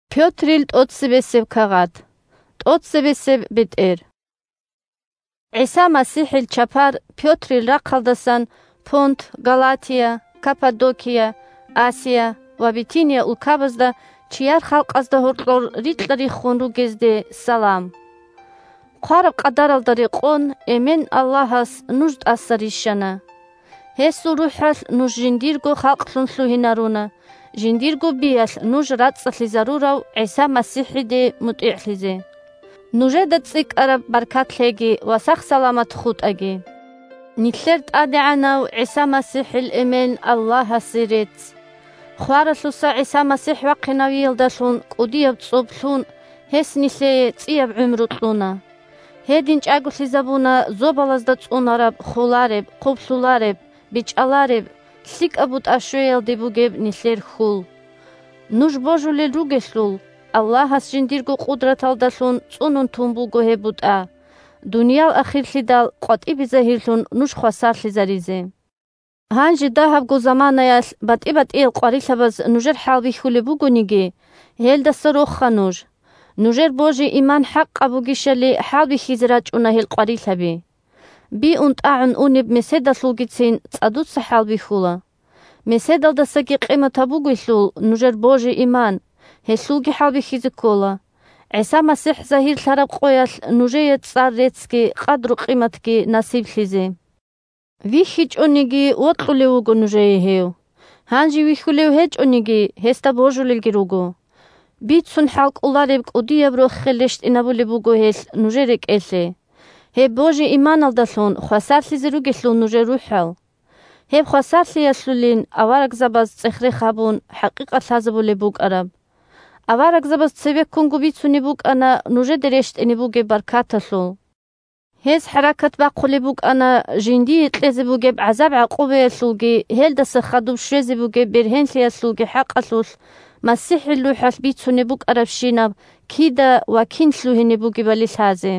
бетӀер Саламалъул рагӀаби 1-2ГӀиса МасихӀил чапар Пётрил рахъалдасан Понт, Галатия, Каппадокия, Асия ва Битиния улкабазда чияр халкъазда гьоркьор рикьа-риххун ругезде салам. Хъвараб къадаралда рекъон Эмен – Аллагьас нуж тӀаса рищана. Гьесул РухӀалъ нуж жиндирго халкълъун лъугьинаруна, жиндирго биялъ нуж рацӀцӀалъизарурав ГӀиса МасихӀиде мутӀигӀлъизе. Нужеда цӀикӀкӀараб баркат лъеги ва сах-саламат хутӀаги. Нилъер ТӀадегӀанав ГӀиса МасихӀил Эмен – Аллагьасе рецц. Хваралъуса ГӀиса МасихӀ вахъинавиялдалъун, кӀудияб цӀоб лъун, гьес нилъее цӀияб гӀумру кьуна. Гьедин чӀаголъизабуна зобалазда цӀунараб холареб, хъублъулареб, бечӀалареб лъикӀаб бутӀа щвеялде бугеб нилъер хьул. Нуж божулел ругелъул, Аллагьас жиндирго къудраталдалъун цӀунун тун буго гьеб бутӀа, дуниял ахирлъидал къватӀибе загьирлъун, нуж хвасарлъизаризе. Гьанже дагьабго заманаялъ батӀи-батӀиял къварилъабаз нужер хӀалбихьулеб бугониги, гьелдаса роха нуж. Нужер божи-иман хӀакъаб бугищали хӀалбихьизе рачӀуна гьел къварилъаби. Биун-тӀагӀун унеб меседалъулгицин цӀадуца хӀалбихьула. Меседалдасаги къиматаб бугелъул нужер божи-иман, гьелъулги хӀалбихьизе ккола, ГӀиса МасихӀ загьирлъараб къоялъ нужее цӀар-реццги къадру-къиматги насиблъизе. ВихьичӀониги вокьулев вуго нужее гьев; гьанже вихьулев гьечӀониги, гьесда божулелги руго. Бицун хӀалкӀолареб кӀудияб рохел рещтӀинабулеб буго гьелъ нужер рекӀелъе, гьеб божи-иманалдалъун хвасарлъизе ругелъул нужер рухӀал! Гьеб хвасарлъиялъулин аварагзабаз, цӀех-рех гьабун, хӀакъикъат лъазабулеб букӀараб. Аварагзабаз цебеккунго бицунеб букӀана нужеде рещтӀине бугеб баркаталъул. Гьез хӀаракат бахъулеб букӀана жиндие кьезе бугеб гӀазаб-гӀакъубаялъулги гьелдаса хадуб щвезе бугеб бергьенлъиялъулги хӀакъалъулъ МасихӀил РухӀалъ бицунеб букӀарабщинаб кида ва кин лъугьине бугебали лъазе.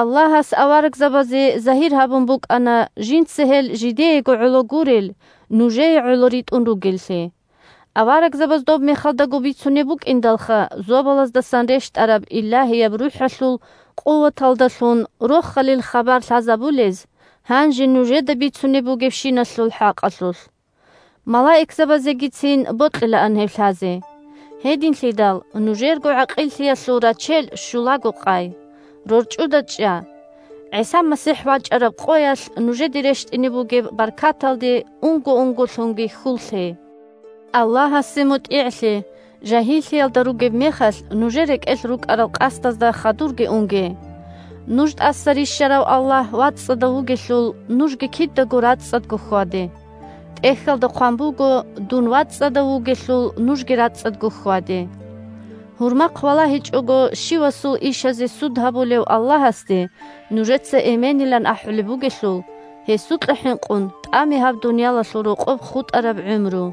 Аллагьас аварагзабазе загьир гьабун букӀана, жинца гьел жидеего гӀоло гурел, нужее гӀоло ритӀун ругеллъи. Аварагзабаз доб мехалдаго бицунеб букӀиндалха зобалаздасан рещтӀараб Илагьияб РухӀалъул къуваталдалъун Рохалил хабар лъазабулез гьанже нужеда бицунеб бугебщиналъул хӀакъалъулъ. Малаикзабазегицин бокьилаан гьеб лъазе. Гьединлъидал нужерго гӀакъиллъиялъул рачел щулаго къай. РорчӀуда чӀа. ГӀиса МасихӀ вачӀараб къоялъ нужеде рещтӀине бугеб баркаталде унго-унголъунги хьул лъе. Аллагьасде мутӀигӀлъе, жагьиллъиялда ругеб мехалъ нужер рекӀелъ рукӀарал къасдазда хадурги унге. Нуж тӀаса рищарав Аллагь вацӀцӀадав вугелъул, нужги кидаго рацӀцӀадго хьваде. ТӀехьалда хъван буго: «Дун вацӀцӀадав вугелъул, нужги рацӀцӀадго хьваде». Гьурмахъ валагьичӀого щивасул ишазе суд гьабулев Аллагьасде нужеца Эменилан ахӀулеб бугелъул, гьесукьа хӀинкъун тӀаме гьаб дуниялалъул рокъоб хутӀараб гӀумру.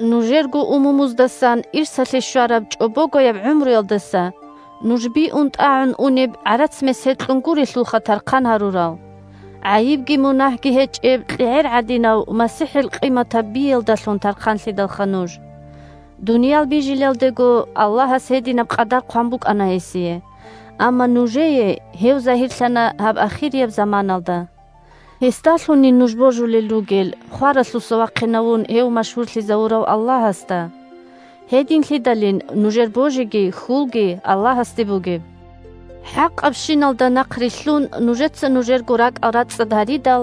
Нужерго умумуздасан ирсалъе щвараб чӀобогояб гӀумруялдаса нуж биун-тӀагӀун унеб гӀарац-месед кьун гурелъулха тархъан гьарурал. ГӀайибги мунагьги гьечӀеб КьегӀер гӀадинав МасихӀил къиматаб биялдалъун тархъанлъидалха нуж. Дуниял бижилелдего Аллагьас гьединаб къадар хъван букӀана гьесие, амма нужее гьев загьирлъана гьаб ахирияб заманалда. Гьесдалъунин нуж божулел ругел, хваралъуса вахъинавун гьев машгьурлъизавурав Аллагьасда. Гьединлъидалин нужер божиги хьулги Аллагьасде бугеб. ХӀакъабщиналда нахърилълъун нужеца нужерго ракӀал рацӀцӀад гьаридал,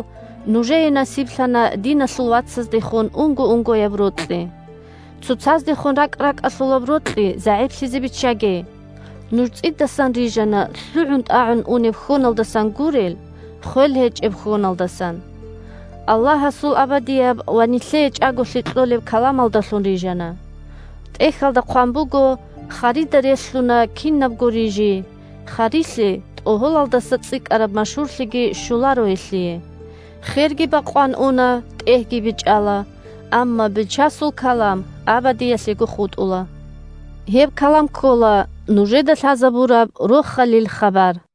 нужее насиблъана диналъул вацаздехун унго-унгояб рокьи. Цоцаздехун ракӀ-ракӀалъулаб рокьи загӀиплъизе биччаге. Нуж цӀидасан рижана, лъугӀун-тӀагӀун унеб хьоналдасан гурел, хвел гьечӀеб хьоналдасан. Аллагьасул абадияб ва нилъее чӀаголъи кьолеб каламалдалъун рижана. ТӀехьалда хъван буго: «Харида релълъуна кинабго рижи, харилъе тӀогьолалдаса цӀикӀкӀараб машгьурлъиги щоларо гьелъие. Херги бакъван уна, тӀегьги бечӀала, амма Бичасул калам абадиялъего хутӀула». Гьеб калам ккола нужеда лъазабураб Рохалил хабар.